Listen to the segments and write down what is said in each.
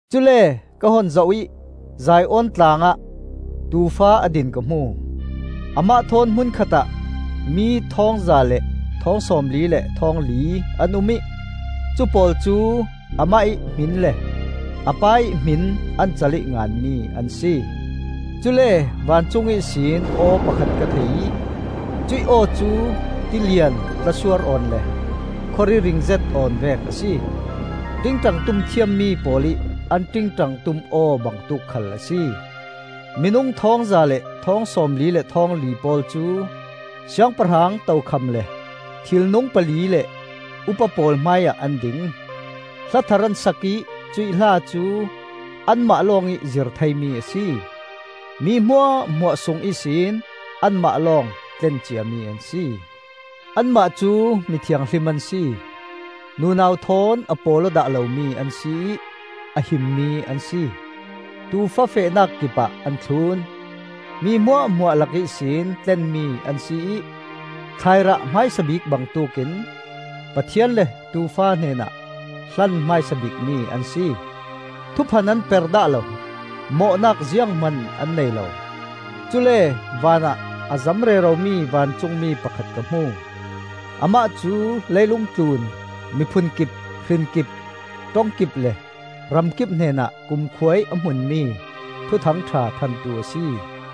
Cule ka hun zoh ih Zion Tlangah Tuufa a din ka hmu; amah thawn hmun khatah mi thawngza le thawng sawmli le thawngli an um ih cu pawl cu amah ih hmin le a Pa ih hmin an cal ih nganmi an si. Cule vancung ihsin aw pakhat ka thei ih cuih aw cu tilian tlasuar awn le khawri ringzet awn vek a si. Ṭingṭang tum thiammi pawl ih an ṭingṭang tum aw bangtuk khal a si. Minung thawngza le thawng sawmli le thawngli pawl cu siangpahrang tokham le thilnung pali le upa pawl hmaiah an ding. Hla thar an sak ih cuih hla cu anmah lawngih zir theimi a si. Mi hmuahhmuah sung ihsin anmah lawng tlen ciami an si. Anmah cu mi thianghlim an si, nunau thawn a pawl aw dah lomi an si ih a himmi an si. Tuufa fehnak kipah an thlun. Mi hmuahhmuah lak ihsin tlenmi an si ih, thlairah hmaisa bik bangtuk in, Pathian le Tuufa hnenah hlan hmaisa bikmi an si. Thuphan an per dah lo; mawhnak zianghman an nei lo. Cule vanah a zam reromi vancungmi pakhat ka hmu. Amah cu leilung tlun miphun kip, hrin kip, ṭong kip le ram kip hnenah kumkhua ih a hmunmi Thuthang ṭha thantu a si.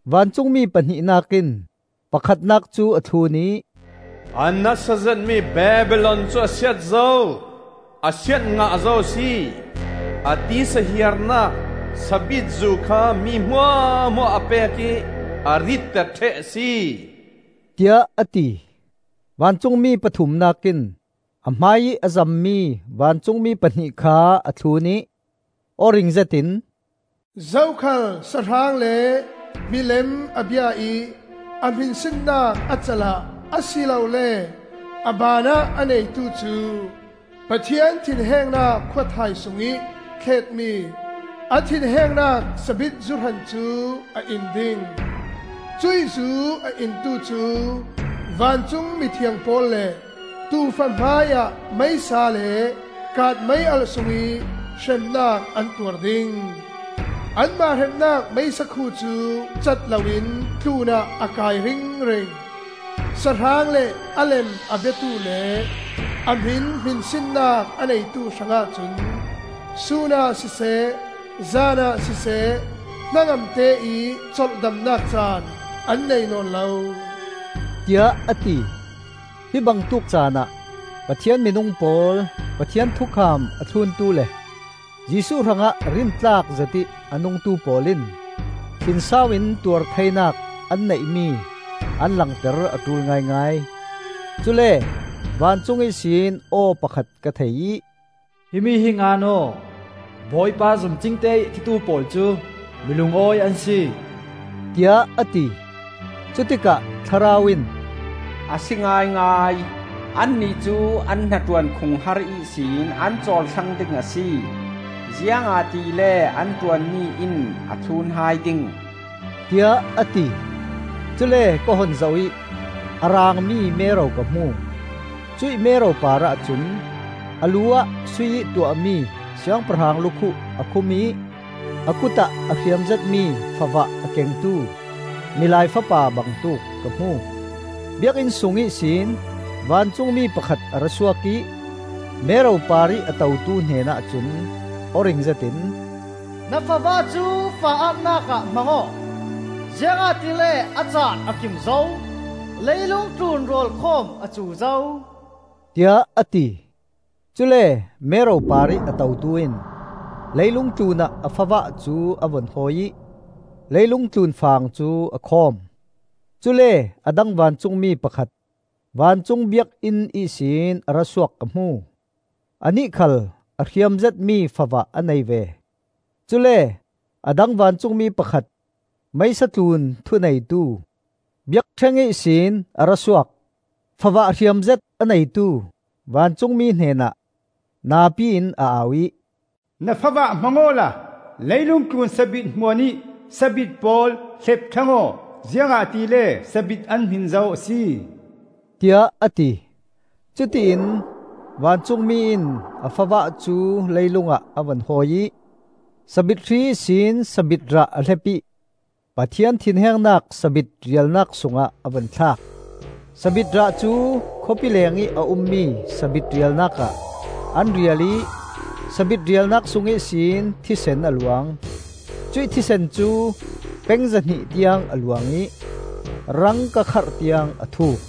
Vancungmi pahnihnak in pakhatnak cu a thlun ih, “A nasa zetmi Babilon cu a siat zo, a siat ngah zo a si. A tisa hiarnak sabitzu kha mi hmuahhmuah a pek ih, a ritter ṭheh a si,” tiah a ti. Vancungmi pathumnak in a hmaiih a zammi vancungmi pahnih kha a thlun ih aw ring zetin, “Zokhal sahrang le milem a bia ih a hminsinnak a cal ah a si lo le a baan ah a neitu cu, Pathian thinhengnak khuathai sungih thletmi a thinhengnak sabitzu hran cu a in ding. Cuih zu a intu cu vancung mithiang pawl le Tuufa hmaiah meisa le kaat mei-alh sungih hremnak an tuar ding. Anmah hremnak meisa khu cu cat loin tlunah a kai ringring. Sahrang le a lem a biatu le a hmin hminsinnak a neitu hrangah cun sunah siseh zanah siseh hnangamte ih colhdamnak caan an nei nawn lo,” tiah a ti. Hi bangtuk caanah Pathian minung pawl, Pathian thukham a thluntu le Jesuh hrangah rintlak zetih a nungtu pawl in thinsau in tuar theinak an neihmi an langter a ṭul ngaingai. Cule vancung ihsin aw pakhat ka thei ih, “Himi hi ngan aw. Bawipa zum cingte ih a thitu pawl cu mi lungawi an si,” tiah a ti. Cutikah Thlarau in, “A si ngaingai! Annih cu an hnaṭuan khunghar ihsin an cawl thlang ding a si; ziangahtile an ṭuanmi in a thlun hai ding,” tiah a ti. Cule ka hun zoh ih a raangmi mero ka hmu; cuih mero parah cun a lu ah sui-ih tuahmi siangpahrang lukhuh a khum ih a kutah a hriam zetmi favah a kengtu Milai Fapa bangtuk ka hmu. Biakinn sung ihsin vancungmi pakhat a ra suak ih mero parih a totu hnenah cun aw ring zetin, “Na favah cu fang ah-nak ah hmang aw, ziangahtile a caan a kim zo; leilung tlun rawlkhawm a cu zo,” tiah a ti. Cule mero parih a totu in leilung tlunah a favah cu a vun hawi ih leilung tlun fang cu a khawm. Cule a dang vancungmi pakhat vancung biakinn ihsin a ra suak ka hmu; anih khal a hriam zetmi favah a nei ve. Cule a dang vancungmi pakhat, meisa tlun thuneitu, biakṭheng ihsin a ra suak. Favah hriam zet a neitu vancungmi hnenah napi in a au ih, “Na favah hmang awla leilung tlun sabit hmuanih sabit pawl hlep thlang aw; ziangahtile sabit an hmin zo a si,” tiah a ti. Cutiin vancungmi in a favah cu leilungah a vun hawi ih sabit hri ihsin sabit rah a hlep ih Pathian thinhengnak sabit rialnak sungah a vun thlak. Sabit rah cu khawpi lengih a ummi sabit rialnak ah an rial ih sabit rialnak sung ihsin thisen a luang; cuih thisen cu peng zahnih tiang a luang ih rang kakharh tiang a thuk.